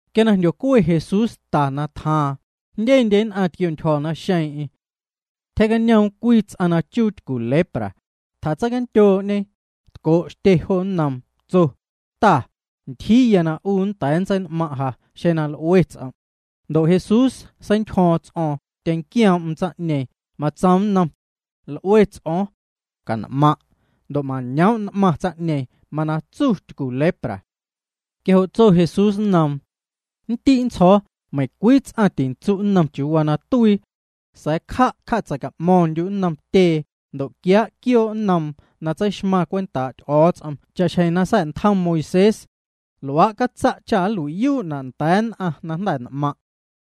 Quia na jndyocue Jesús ta na tjaaⁿ, jndyendye nn'aⁿ tquiontyjo̱ naxeeⁿ'eⁿ. Tyjee'cañoom cwii ts'aⁿ na chuu tycu lepra, tjatseicandyoo'ñe, tco' xtye jo nnoom, tso: —Ta, ntyjii na 'u nnda̱a̱ nntsein'maⁿ' ja, xeⁿ l'ue ts'om'. Ndo' Jesús seintyjo̱o̱ⁿ ts'o̱o̱ⁿ, tyenquioom'm tsaⁿ'ñeeⁿ, matsoom nnom: —L'ue ts'o̱o̱ⁿ. Can'maⁿ'. Ndo' mañoom' n'maⁿ tsaⁿ'ñeeⁿ, mana tsu tycu lepra. Quia jo' tso Jesús nnoom: —Ndi' nntsjo̱o̱, meiⁿcwii ts'aⁿ ticatsu' nnom chiuu waa na tuii. Sa̱a̱ cja', cja'tseica'mo̱ⁿndyu' nnom tyee, ndo' quiaa' quioo' nnoom na tseixmaⁿ cwentaa' Ty'o̱o̱ts'om cha'xjeⁿ na sa̱'ntjom Moisés. Luaa' catsa' cha calui'yuu'na' nda̱a̱ nn'aⁿ na jnda̱ n'maⁿ'.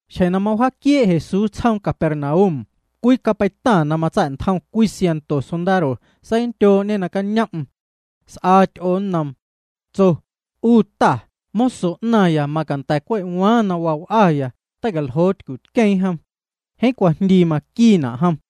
Xjeⁿ na mawjaaquiee' Jesús tsjoom Capernaum, cwii capeitaⁿ na matsa̱'ntjom cwii siaⁿnto sondaro seicandyoo'ñe nacañom'm. S'aa ty'oo nnoom. Tso: —'U Ta, moso 'naⁿya macanda̱ cwe' waaⁿ na waa w'aya, tei'caljoo tycutqueeⁿ jom. Jeeⁿ cwajndii maquiina' jom.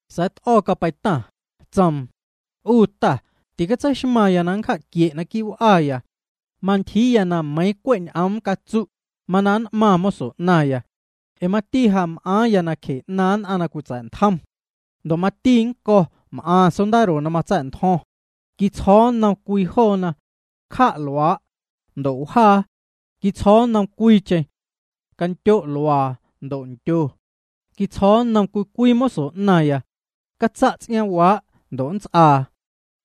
Sa̱a̱ t'o̱ capeitaⁿ, tsoom: —'U Ta, ticatseixmaⁿya na nncja'quie' naquii' w'aya. Mantyjii meiiⁿ cwe' ñ'oom catsu', mana nn'maⁿ moso 'naⁿya. Ee mati ja m'aaⁿya nacje 'naaⁿ nn'aⁿ na cwitsa̱'ntjom. Ndo' mati nnco̱ m'aⁿ sondaro na matsa̱'ntjo̱ⁿ. Quitsjo̱o̱ nnom cwii joona: “Cja' luaa'”, ndo' wjaa. Quitsjo̱o̱ nnom cwiicheⁿ: “Candyo' luaa”, ndo' ndyo. Quitsjo̱o̱ nnom cwii cwii moso 'naⁿya: “Catsa' ts'iaaⁿwaa'”, ndo' nts'aa.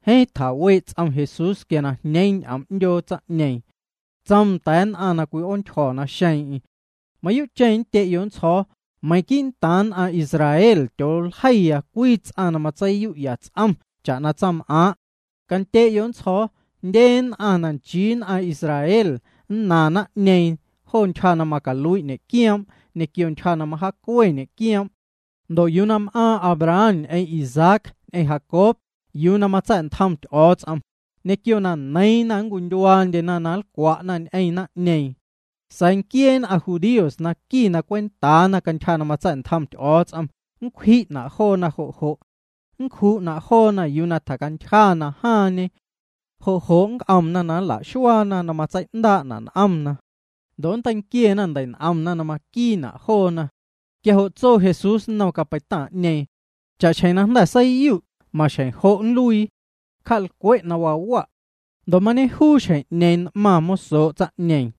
Jeeⁿ tjawee' ts'om Jesús quia na jñeeⁿ ñ'oom 'ndyoo tsaⁿ'ñeeⁿ. Tsoom nda̱a̱ nn'aⁿ na cwi'oontyjo̱ naxeeⁿ'eⁿ: —Mayuu'cheⁿ nndye'yo' nntsjo̱o̱, meiⁿ quii'ntaaⁿ nn'aⁿ Israel tyooljei cwii ts'aⁿ na matseiyu'ya ts'om cha'na tsaⁿm'aaⁿ'. Candye'yo' nntsjo̱o̱, jndye nn'aⁿ na nchii nn'aⁿ Israel nnaⁿ naⁿ'ñeeⁿ jo ntyja na macalui' ñe'quioom' ñequio ntyja na mawjaacue ñe'quioom'. Ndo' yuu na m'aⁿ Abraham ñ'eⁿ Isaac ñ'eⁿ Jacob yuu na matsa̱'ntjom Ty'o̱o̱ts'om, ñequio na neiiⁿna nncwindyuaandyena na nlcwa'na ñ'eⁿ naⁿ'ñeeⁿ. Sa̱a̱ nquiee nn'aⁿ judíos na qui na cwentaana cantyja na matsa̱'ntjom Ty'o̱o̱ts'om, nncwji'na' joona jo' jo'. Nncju'na' joona yuu na tjacantyja na jaaⁿñe. Jo' jo' nnc'omna na nla'xuaana na matsei'ndaa'na' n'omna. Ndo' nnteinquiena ndei'n'omna na maquiina' joona. Quia jo' tso Jesús nnom capeitaⁿ'ñeeⁿ: —Cha'xjeⁿ na jnda̱ seiyu', maxjeⁿ jo' nluii. Cja'lcwe' na waa wa'. Ndo' mañejuu xjeⁿ'ñeeⁿ n'maⁿ mosoo' tsaⁿ'ñeeⁿ.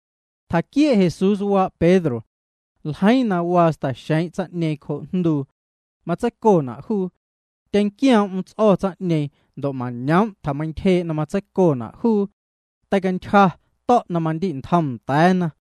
Tjaquiee' Jesús waa' Pedro. Ljeiiⁿ na waa sta̱xeeⁿ' tsaⁿ'ñeeⁿ cjoo' jnduu. Matseicona' juu. Tyenquioom'm ts'o̱ tsaⁿ'ñeeⁿ ndo' mañoom' tjameintyjee' na matseicona' juu. Teicantyja, to̱' na mandi'ntjom nda̱a̱na.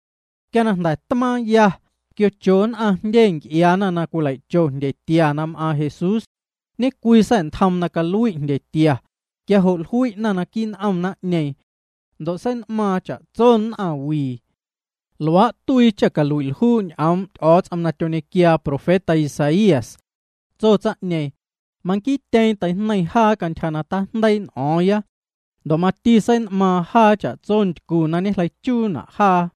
Quia na jnda̱ tmaaⁿya, tquiocho nn'aⁿ jndye nc'iaana na cwilei'cho jndyetia na m'aaⁿ Jesús. Ñe'cwii sa̱'ntjoom na calui' jndyetia, quia jo' jlui'na naquii' n'om naⁿ'ñeeⁿ. Ndo' sein'maaⁿ cha'tso nn'aⁿwii. Luaa' tuii cha calui'ljuu' ñ'oom' Ty'o̱o̱ts'om na tyoñequiaa profeta Isaías. Tso tsaⁿ'ñeeⁿ: “Manquiityeeⁿ teijneiⁿ jaa cantyja na tijndeii' n'o̱o̱ⁿya. Ndo' mati sein'maaⁿ jaa cha'tso ntycu na ñejleichuuna' jaa.”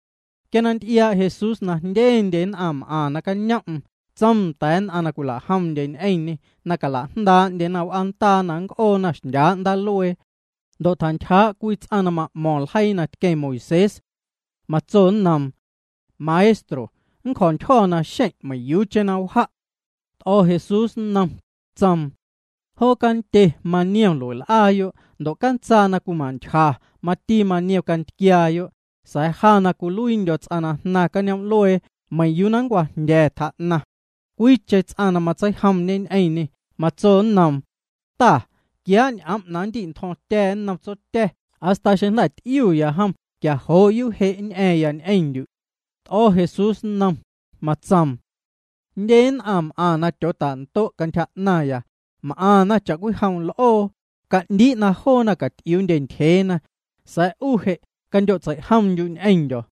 Quia na nty'iaa' Jesús na jndyendye nn'aⁿ m'aⁿ nacañom'm, tsoom nda̱a̱ nn'aⁿ na cwila'jomndye ñ'eⁿñê na cala'jndaa'ndyena w'aandaa na nnc'oona xndyaa' ndaaluee. Ndo' tjantyjaa' cwii ts'aⁿ na ma'mo̱ⁿ ljeii na tqueⁿ Moisés. Matso nnoom: —Maestro, nncjo̱ntyjo̱ naxeⁿ' meiⁿyuucheⁿ na wja'. T'o̱ Jesús nnom, tsoom: —Joo canndye maniom lue'w'aayo' ndo' cantsaa na cwima'ntyja mati maniom cantquiaayo', sa̱a̱ ja na cwiluiindyo̱ ts'aⁿ na jnaⁿ cañoom'luee meiⁿ yuu na nncwajndya̱, tjaa'naⁿ. Cwiicheⁿ ts'aⁿ na matseijomñe ñ'eⁿñê, matso nnoom: —Ta, quiaa' ñ'om' na nndi'ntjo̱ⁿtya̱ nnom tsotya̱, hasta xeⁿ jnda̱ ty'iuya jom, quia jo' yuu' je' nñ'a̱ⁿya ñ'eⁿndyu'. T'o̱ Jesús nnom, matsoom: —Jndye nn'aⁿ m'aⁿ na tyootando' cantyja 'naⁿya. M'aⁿna cha'cwijom l'oo. Ca'ndii' na joona caty'iuundye ntyjeena. Sa̱a̱ 'u je', candyo'tseijomndyu' ñ'eⁿndyo̱.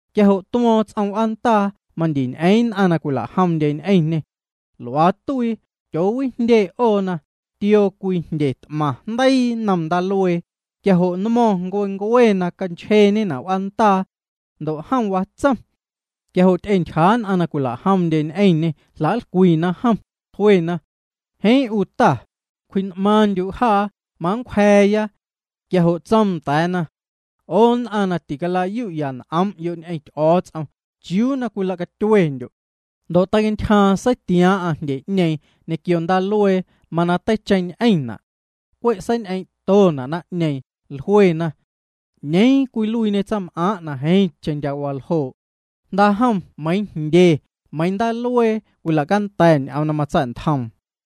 Quia jo' tuo̱o̱ⁿ ts'om w'aandaa, mandi ñ'eeⁿ nn'aⁿ na cwila'jomndye ñ'eⁿñê. Luaa tuii, tyoowijndye 'oona, tioo cwii jndye t'maⁿ jndeii nnom ndaaluee, mawaa na wjaanchjeeñe nmo̱ⁿ w'aandaa. Ndo' jom watsom. Ndo' ty'entyjaa' nn'aⁿ na cwila'jomndye ñ'eⁿñê jla'nlcwina jom, jluena: —Jeeⁿ 'u Ta, cwji'n'maaⁿndyu' jaa, manncwja̱a̱ya. Quia jo' tsoom nda̱a̱na: —'O nn'aⁿ na ticala'yu'ya n'om'yo' ñ'eⁿ Ty'o̱o̱ts'om, ¿chiuu na cwilacatyuendyo'? Ndo' teicantyjaaⁿ, seitiaaⁿ'aⁿ jndye'ñeeⁿ ñequio ndaaluee, mana teicheⁿñ'eⁿna'. Cwe' seiñ'eeⁿ'tona' naⁿ'ñeeⁿ, jluena: —¿'Ñeeⁿ cwiluiiñe tsaⁿm'aaⁿ' na jeeⁿcheⁿ ndya' waljoo'? Jnda'jom meiiⁿ jndye, meiiⁿ ndaaluee cwila'canda̱na' ñ'oom na matsa̱'ntjoom.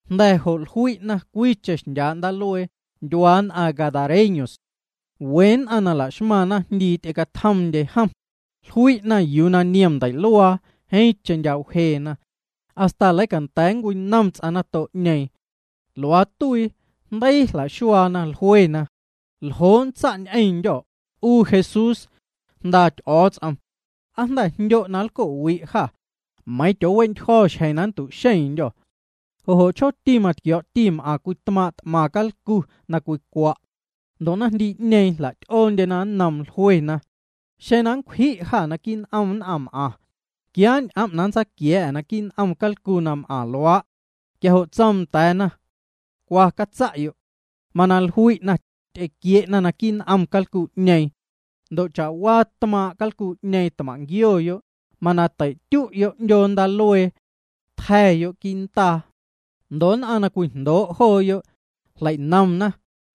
Jnda̱ jo' jlui'na cwiicheⁿ xndyaa' ndaaluee, ndyuaa nn'aⁿ gadarenos, we nn'aⁿ na la'xmaⁿ naⁿjndii ty'ecatjomndye jom. Jlui'na yuu niom ndei'luaa, jeeⁿcheⁿ ndya' wjeena hasta leicanda̱a̱ nncwinom ts'aⁿ nato'ñeeⁿ. Luaa tuii, jndeii jla'xuaana, jluena: —¿Ljo' nntsa' ñ'eⁿndyô̱, 'u Jesús, Jnda Ty'o̱o̱ts'om? ¿Aa jnda̱ jndyo' na nlco'wi' jâ, meiiⁿ tyoowe'ntyjo̱ xjeⁿ na nntu'xeⁿndyô̱? Jo' jo' chjooti matquio̱o̱'ti m'aⁿ cwii tmaaⁿ' t'maⁿ calcu na cwicwa'. Ndo' naⁿjndii'ñeeⁿ jla'ty'oondyena nnoom jluena: —Xeⁿ na nncwji' jâ naquii' n'om naⁿm'aⁿ, quiaa' ñ'om' na nntsaquia̱a̱'â naquii' n'om calcu na m'aⁿ luaa'. Quia jo' tsoom nda̱a̱na: —Cwa, catsa'yo'. Mana jlui'na, ty'equie'nomna naquii' n'om calcu'ñeeⁿ. Ndo' cha'waa tmaaⁿ' calcu'ñeeⁿ tmaⁿ'nquioyo', mana tei'tyu'yo' 'ndyoo ndaaluee. Tja̱yo' quii' ndaa. Ndo' nn'aⁿ na cwijndoo' jooyo', jlei'nomna,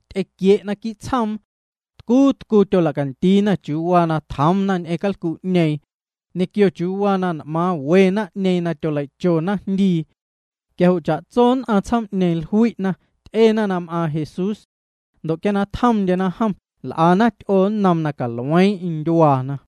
ty'equie'na quii' tsjoom. Tcuu tcuu tyola'candiina chiuu waa na tjoomna ñ'eⁿ calcu'ñeeⁿ ñequio chiuu waa na n'maaⁿ we naⁿ'ñeeⁿ na tyolei'cho naⁿjndii. Quia jo' cha'tso nn'aⁿ tsjoom'ñeeⁿ jlui'na, ty'ena na m'aaⁿ Jesús. Ndo' quia na tjomndyena jom, l'ana ty'oo nnoom na calueeⁿ'eⁿ ndyuaana.